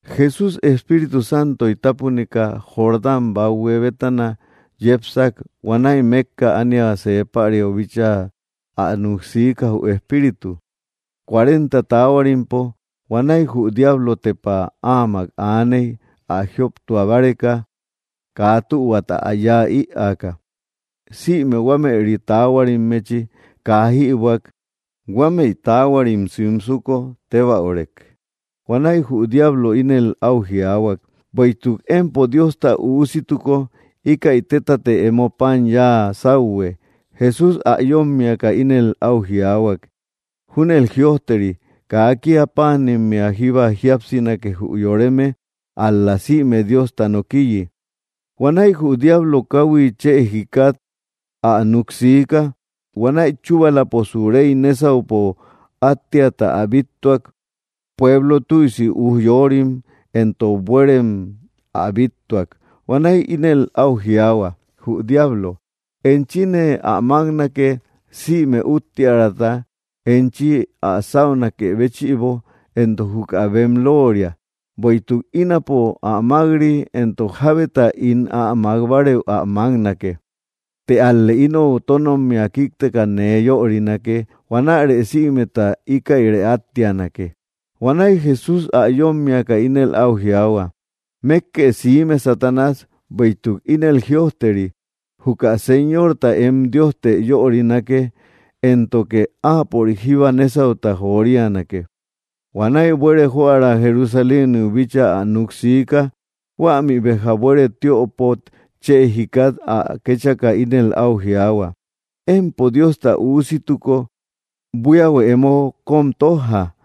Jesús, Espíritu Santoy tápunika, Jordán bathue bétana yepsak. Huanäi mékka ániau see päriau bíchaa ä núk siika, jü Espíritu, cuarenta taahuarimpo. Huanäi jü diablo tepa áamak aaney, ä jioptua báreka, kaa tühuata ä yáa ïaka. Sïme huameri taahuarimmechi kaa jïbuäk, huamei taahuarim simsuko tébäurek. Huanäi jü diablo ínel áu jiaahuak: —Bueïtuk empo Diosta Üusituko, íkäi tétatë emo pan yáa sáuhue. Jesús ä yómmiaka ínel áu jiaahuak: —Júnel jïojteri: “Kaa kía páanimmea jíba jíapsinake jü yoreme, ál‑la sïme Diosta nokiyi.” Huanäi jü diablo káhuit chë jikat ä núk siika, huanäi chúbalaposu rey nesaupo attiata ä bíttuak, pueblo tüisi ujyorim éntok bueerem, ä bíttuak. Huanäi ínel áu jiaahuak jü diablo: —Enchine ä máknake sïme úttiärata, enchi ä sáunakë béchïbo. Entok juka bem looria. Bueïtuk ínapo ä mak‑ri; entok jabeta ín ä makbareu ä maknake. Të ál‑lë inou tónommia kíkteka nee yörinake. Huanärë sïmeta íkäirë áttianake. Huanäi Jesús ä yómmiaka ínel áu jiaahuak: —Mékkë siime, Satanás, bueïtuk ínel jïojteri: “Juka Señorta em Diostë yörinake, éntoke áapörik jíba nésauta jorianake.” Huanäi buere joära Jerusaléniu bíchaa ä núk siika. Huämi béja buere tiöpot chë jikat ä kéchaka ínel áu jiaahuak: —Empo Diosta Üusituko, buíahuë emo kóm tójja,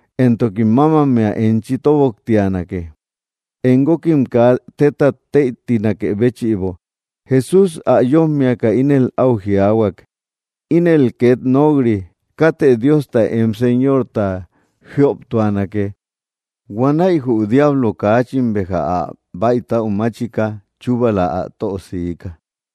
Éntokim mámammea enchi tóboktianake, em guókim kaa tétat tëitinakë béchïbo. Jesús ä yómmiaka ínel áu jiaahuak: —Ínel két nok‑ri: “Katë Diosta em Señorta jíoptuanake.” Huanäi jü diablo, kaachin béja ä bäitäu máchika, chubala ä tö siika.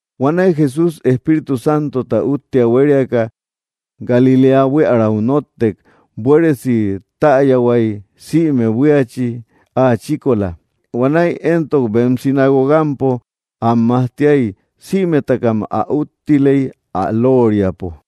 Huanäi Jesús, Espíritu Santota úttia huériaka, Galiléa buiärau nóttek. Buéresi tayahuay, sïme buíachi ä chíkola. Huanäi éntok bem sinagogampo am majtiay. Sïmetakam ä úttiley ä looriapo.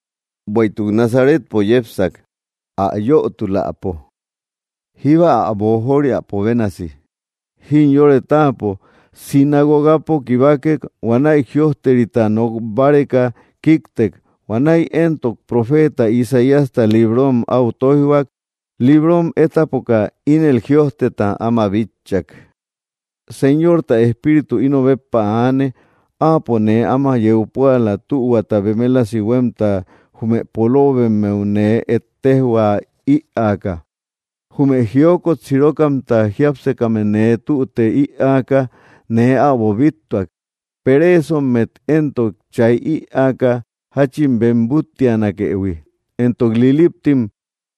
Bueïtuk Nazaretpo yepsak, ä yötuläpo. Jíba ä boojoriapo bénasi, jimyore táapo sinagogapo kibakek, huanäi jïojterita nok báreka kíktek. Huanäi éntok profeeta Isaíasta librom áu tóijhuak, librom étapoka, ínel jïojteta áma bitchak: Señorta Espíritu ino béppa aane, áapo nee áma yeu púala tühuata bemelasi huémta jume poloobemmeu nee ejtejhuä ïaaka. Jume jiokot sirokamta jiápsekame nee tüte ïaaka nee äbo bíttuak, pereesommet éntok chay ïaaka jáchin bem búttiatunakëhui, éntok liliptim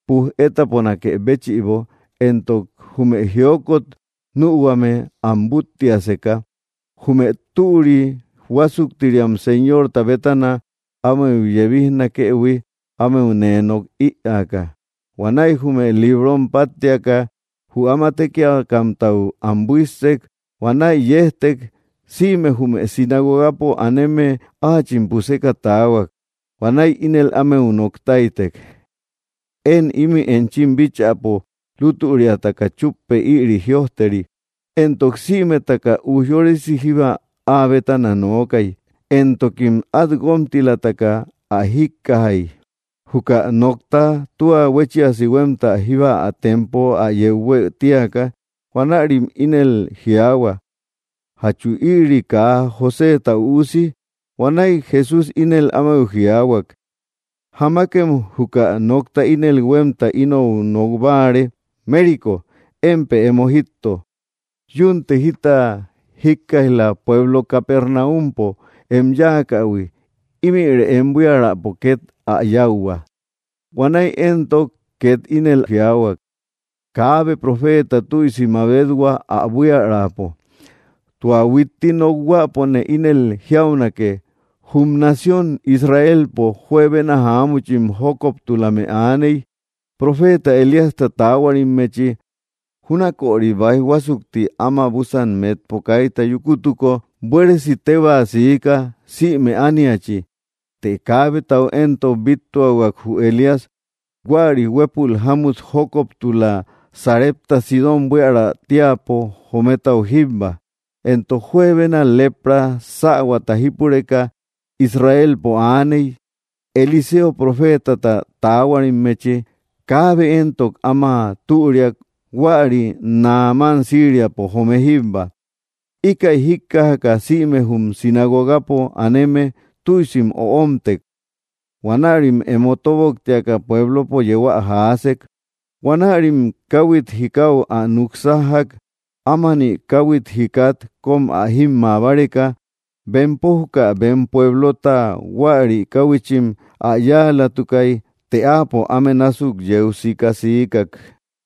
puj etaponakë béchïbo, éntok jume jiokot nühuame am búttiaseka, jume türi huásuktiriam Señorta bétana ámeu yebijnakëhui, ámeu nee nok ïaaka. Huanäi jume librom páttiaka, jü áma tékiakamtau am buíssek. Huanäi yejtek. Sïme jume sinagogapo aneme áachim puseka taahuak, huanäi ínel ámeu nok táytek: —Én ímï enchim bíchäpo lútüriataka chúppe, ïri jïojteri. Éntok sïmetaka ujyorisi jíba áa bétana nookay, éntokim át guómtilataka ä jíkkajay, juka nokta tua huéchiasi huémta jíba ä tempo ä yeu huë tíaka. Huanärim ínel jiaahua: —¿Jachu ïri kaa Joséta üusi? Huanäi Jesús ínel ámeu jiaahuak: —Jamakem juka nokta ínel huémta inou nok báare: “Mérico, émpë emo jítto. Yúnte jita jíkkaij‑la pueblo Capernaumpo em yáakähui. Ímïre em buiärapo két ä yáuhua.” Huanäi éntok két ínel jiaahuak: —Kaabe profeeta tüisi mabethua ä buiärapo. Tua huitti nokhuäpone ínel jiaunake, jum nación Israelpo juebena jáamuchim jókoptulame aaney, profeta Elíasta taahuarimmechi. Júnaköri báij huásukti áma búsan metpo kaita yúkutuko, buéresi tébaa siika, sïme ániachi. Të kaabetau éntok bíttuahuak jü Elías, huäri huépul jámut jókoptula, Sarepta Sidón buiära tíäpo jometau jíbba. Éntok juebena lepra sähuata jípureka Israelpo aaney, Eliseo profeetata taahuarimmechi. Kaabe éntok áma türiak, huäri Naamán Síriapo joome jíbba. Íkäi jíkkajaka sïme jum sinagogapo aneme, tüisim öomtek. Huanärim emo tóboktiaka, pueblopo yeu ä jaasek. Huanärim káhuit jikau ä núk sájjak, ámani káhuit jikat kóm ä jímmaa báreka. Bempo juka bem pueblota huäri káhuichim ä yáalatukay. Të áapo áme násuk yeu sika, siikak.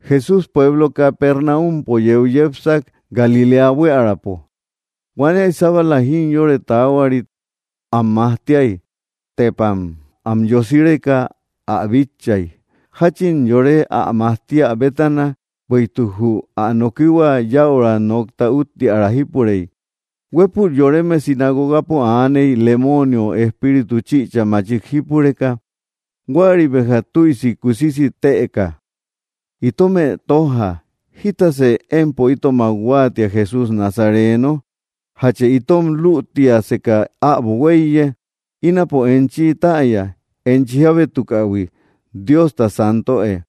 Jesús pueblo Capernaumpo yeu yepsak, Galiléa buiärapo. Huanäi sábala jimyore taahuarit am majtiay. Tepam ä yosireka ä bitchay, jáchin yore ä majtiä bétana, bueïtuk jü ä nokihua, yäura nokta úttiära jípurey. Huépül yoreme sinagogapo aaney, lemoonio espíritu chïcha machik jípureka. Huäri béja tüisi kusisi tëka: —Itomë tójja; ¿jítasë empo itomak huáatia, Jesús Nazareno? ¿Jachë itom lütiaseka äbo huéiye? Ínapo enchi täya, enchi jábétukähui Diosta Santöe.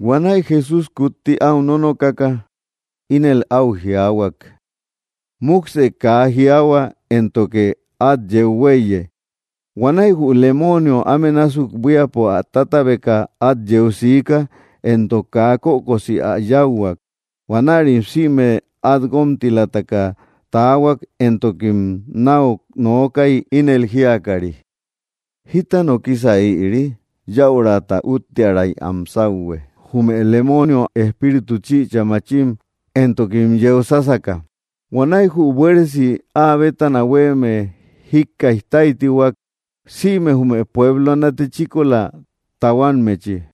Huanäi Jesús kutti áu nónokaka, ínel áu jiaahuak: —¡Múksë kaa jiaahua, éntoke át yeu huéiye! Huanäi jü lemoonio, áme násuk buíapo ä tátabeka, át yeu siika, éntok kaa kökosi ä yáuhuak. Huanärim sïme át guómtilataka taahuak, éntokim náu nookay, ínel jíakari: —¿Jíta nokisa ïri? ¡Yäurata úttiäray am sáuhue, jume lemoonio espíritu chïcha maachim, éntokim yeu sásaka! Huanäi jü buéresi ä bétana hueme jíkkaij táytihuak, sïme jume pueblo natechíkola tahuammechi.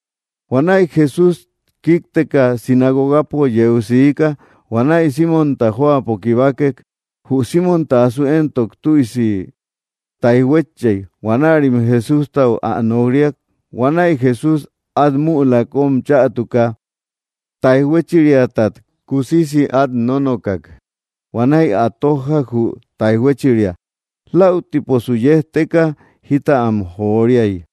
Huanäi Jesús kíkteka sinagogapo yeu siika. Huanäi Símonta jóapo kibakek. Jü Símonta asu éntok tüisi táijhuétchey, huanärim Jesústau ä nok‑riak. Huanäi Jesús, át müla kóm chätuka, táijhuéchiriatat kusisi át nónokak, huanäi ä tójjak, jü táijhuéchiria. Läutiposu yejteka, jita am joriay.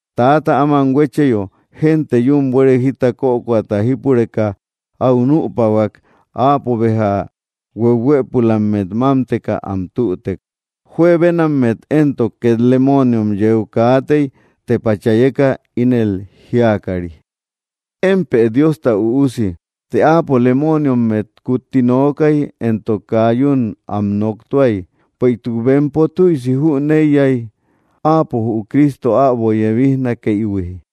Täata áman huécheyo, génte yún buere jita kökoata jípureka áu nüpahuak. Áapo béja huehuëpulammet mámteka am tütek. Juebenammet éntok két lemooniom yeu kaatey, tepa chayeka, ínel jíakari: —¡Émpë Diosta Üusi! Të áapo lemoniommet kutti nookay, éntok kaa yún am noktuay, bueïtuk bempo tüisi jüneiyay, áapo jü Cristo äbo yebisnakëihui.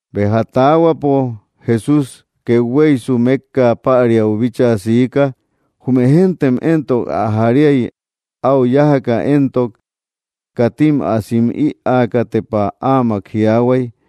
Béja taahuapo, Jesús kethueysu, mékka päriau bíchaa siika. Jume géntem éntok ä jariay, áu yájaka éntok. Katim ä sim ïaaka, tepa áamak jiaahuay.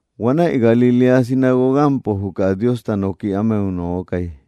Huanäi Galiléa sinagogampo, juka Diosta nooki ámeu nookay.